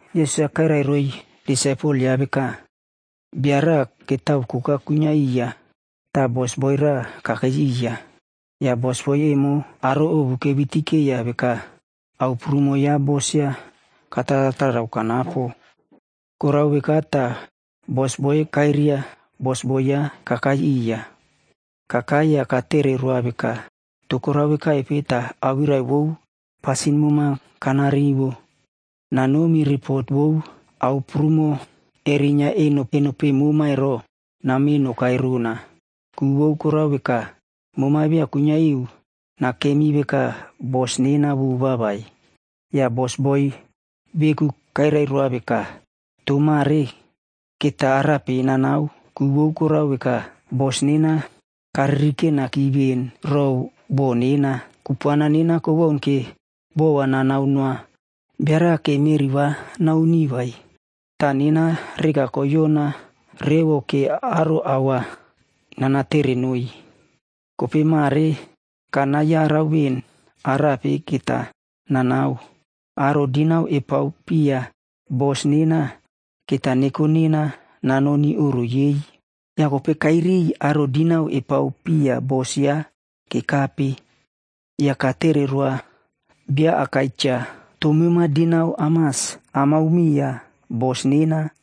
Yesus-a kairai roiy disaipel yaꞌa veka, “Bia raꞌa ketao koka kuinyia iya ta bosboi raꞌa kakei iya. Ya bosboi emo aro ovu kevitikeiya veka, ao prumo ya bos yaꞌa, kataratarao kanapo. Korao veka ta bos-a kairia bosboi yaꞌa kakai iya. Kakai ya katere roa veka, ‘To korao vekaipe ta awirai vou pasin mema kana rivo? Nanomi ripot vou ao prumo kerinyia eno peꞌe mema ero, name nokai rona. Ku vou korao veka, mema via kuinyia iu nakemi veka bosboi nena vova vai.’ “Ya bosboi veku kairai varu veka, ‘To mare keta arape nanao? Ku vou korao veka, bos nena karirikenaki ven row bo nena. Kupuana nena kowaun ke bo va nanao noa bia raꞌa ke meꞌri va nauni vai. Ta nena reka koyona revo ke aro ao va nanatere noiy. Kopei mare kana yarau ven arape keta nanao. Aro dinau epaopiya bos nena, keta neko nena nanoni oꞌro yei.’ “Ya kopei kairiy aro dinau epaopiya bos yaꞌa kekape. Ya katere roa bia akai cha, ‘To mema dinau amas amao miya bos nena?’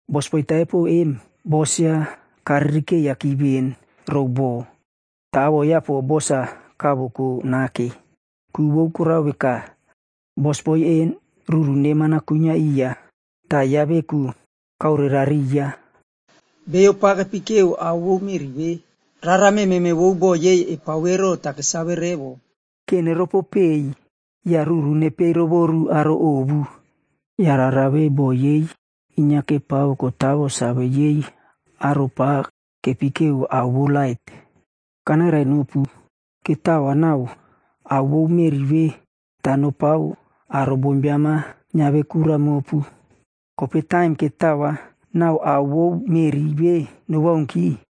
“Bosboi taipo em, bos yaꞌa karirikeiyaki ven row bo, ta awoꞌo yaꞌa po bos-a kavoko nake. Ku vou korao veka, bosboi en ruru neman-a kuinyia iya ta yaꞌa veku kaorerariya. Beiyo pa kepikeo ao vou meꞌri ve, rara mememe vou bo yei epao ero ta kesave revo, ke neropopei ya ruru nepei rovoru aro ovu. Ya rara ve bo yei inyia kepao kotawo save yei aro pa kepikeo ao vou lait. Kanairainopu, ketao va nau ao vou meꞌri ve ta nopao aro bombiam-a nyiave kura mopu. Kopei taim ketao va nau ao vou meꞌri ve nowaunki,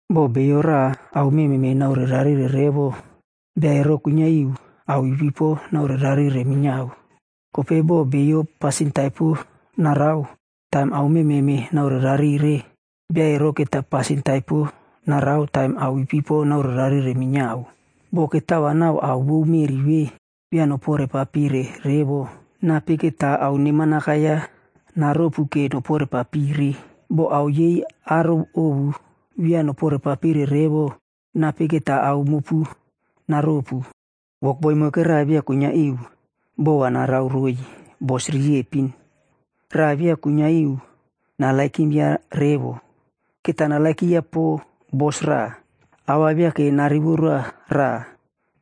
“Bo bio raꞌa ao mememe naorerarire revo, bia ero kuinyia iu ao ipipo naorerarire minyiao. Kopei bo bio pasin taipo narao taim ao mememe naorerarire, bia ero keta pasin taipo narao taim ao ipipo naorerarire minyiao. Bo ketao va nau ao vou meꞌri ve via noporeparire revo, nape keta ao neman akai-ya naropu noporeparire? Bo ao yei aro ovu via noporepapire revo, nape keta ao mopu naropu?” “Wokboi moikera via kuinyia iu bo va narao roiy bos riepin. Raꞌa via kuinyia iu narererova revo, keta narererova po bos raꞌa. A va ta narivo roa raꞌa,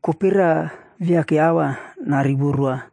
kopei raꞌa viake a va narivo roa.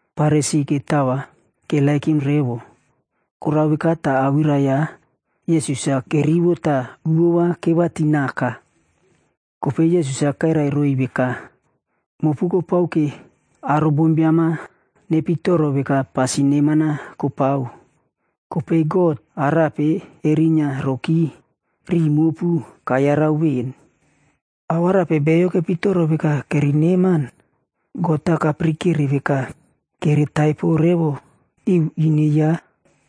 Farisi ketao va keperepow revo. Korao veka ta awirai ya Yesus-a kerivo ta uvo va kevatinaka. Kopei Yesus-a kairai roiy veka, “Mopu kopao ke aro bombiam-a nepitoro veka pasin neman-a kopao. Kopei God, arape erinyia roki riꞌi mopu kayarau ven. Ao arape beiyo kepitoro veka kere neman, God-a kapirikere veka kere taipo revo iu ine yaꞌa.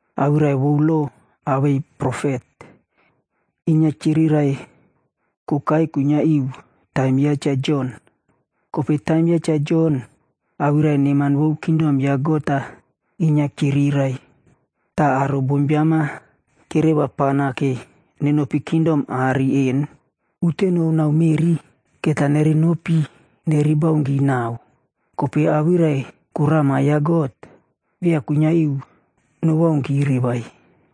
“Awirai vou lo awei profet, inyia kyirirai kokai kuinyia iu taim ya Cha Jon.e Kopei taim ya Cha Jon, awirai neman vou kingdom ya God-a inyia kyirirai. Ta aro bombiam-a kereva pana ke nenopi kingdom aꞌari en. Uteno nau meꞌri keta nere nopi nere baunki nau, kopei awirai korama ya God, via kuinyia iu nowaunki vai.”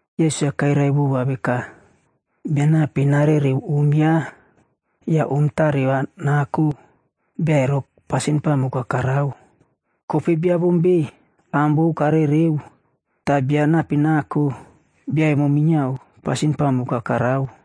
Yesus-a kairai vova veka, “Bia nape narereo om yaꞌa ya om tare va nako, bia ero pasin pamuk-a karao. Kopei bia bom ve am vou karereo ta bia nape nako, bia emo minyiao pasin pamuk-a karao.”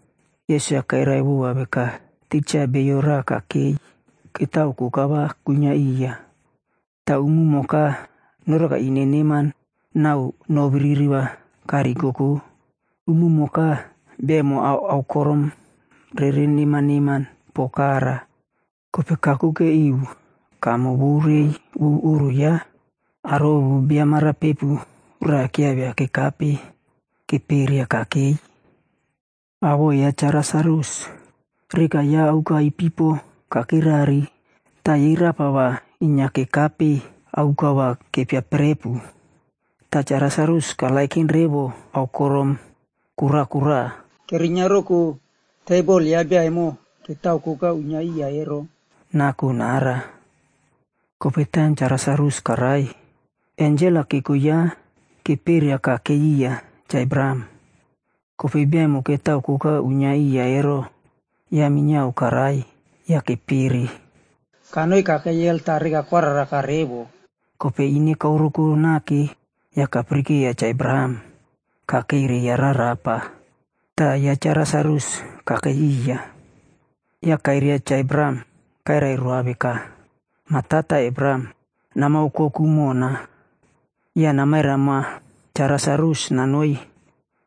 Yesus-a kairai vova veka, “Tija, bio raꞌa kakei ketao koka va kuinyia iya. Ta umumoka noreka ine neman nau no biriri karikoko. Umumoka bia emo aokorom rere neman neman po kara. Kopei kakuke iu kamo vou reiy vou oꞌro yaꞌa, aro ovu bia marapepu raꞌa kyiaivia kekape keperia kakei.f Awoꞌo ya Cha Lasarus. Reka yaꞌa aoka ipipo kakirari ta yei rapa va inyia kekape aoka va kepiaprepu. Ta Cha Lasarus karererow revo aokorom kora kora, kerinyia roko tebol ya bia emo ketao koka kuinyia iya ero, nako nara. “Kopei taim Cha Lasarus karai, ensel-a keko yaꞌa keperia kakei iya Cha Abraham.g Kopei bia emo ketao koka uinyia iya ero, yaꞌa minyiao karai ya kepere. Kanoi kakei helh ta reka koararaka revo. Kopei ine kaoreko nake ya kapirikeiya Cha Abraham kakeireiya rarapa, ta ya Cha Lasarus kakei iya. Ya kairia Cha Abraham kairai roa veka, ‘Ma Tata Abraham, nama okoku mona, ya namairai moa Cha Lasarus nanoi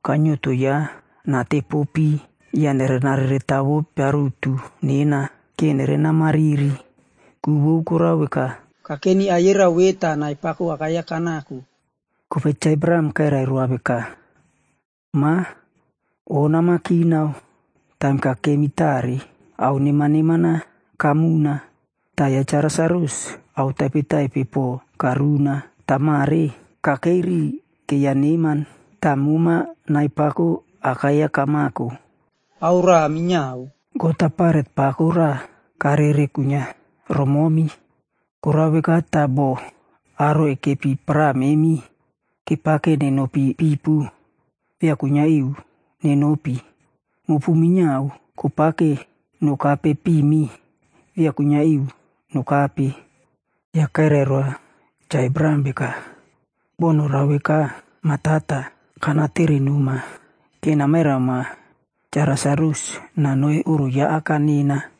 kainyieto yaꞌa nateporo pii ya nareretavo piarutu nena, ke nerena mariri. Ku vou korao veka, kakeni aiyerao ve ta nai pako akai-ya kanako.’ “Kopei Cha Abraham kairai roa veka, ‘Ma, O nama kinao taim kakemi tare, ao neman neman-a kamuna. Ta ya Cha Lasarus, ao taipetaipe po karuna. Ta mare, kakei riꞌi keiya neman, ta moma nai pako akai-ya kamako. Ao raꞌa minyiao, God-a baret pako raꞌa karere kuinyia romomi. Korao veka ta bo aro ekepi para memi kepake nenopi pipu, via kuinyia iu nenopi. Mopu minyiao kopake nokape pimi, via kuinyia iu nokape.’ “Ya kairai roa Cha Abraham veka, ‘Bo norao veka, mah tata, kanatere noma ke namairai moa Cha Lasarus nanoi oꞌro ya aka nena.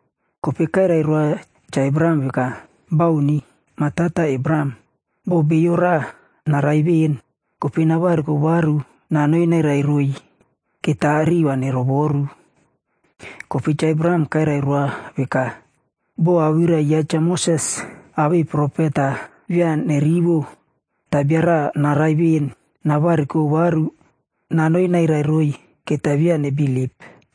“Kopei kairai roa Cha Abraham veka, ‘Bauni, Ma Tata Abraham, bo bio raꞌa narai ven kopei navariko varu nanoi nairai roiy, keta riꞌi va nerovoru.’ “Kopei Cha Abraham kairai roa veka, ‘Bo awirai ya Cha Moses awei profet-a via nerivo, ta bia raꞌa arai ven navariko varu nanoi nairai roiy, keta via nebilip.’”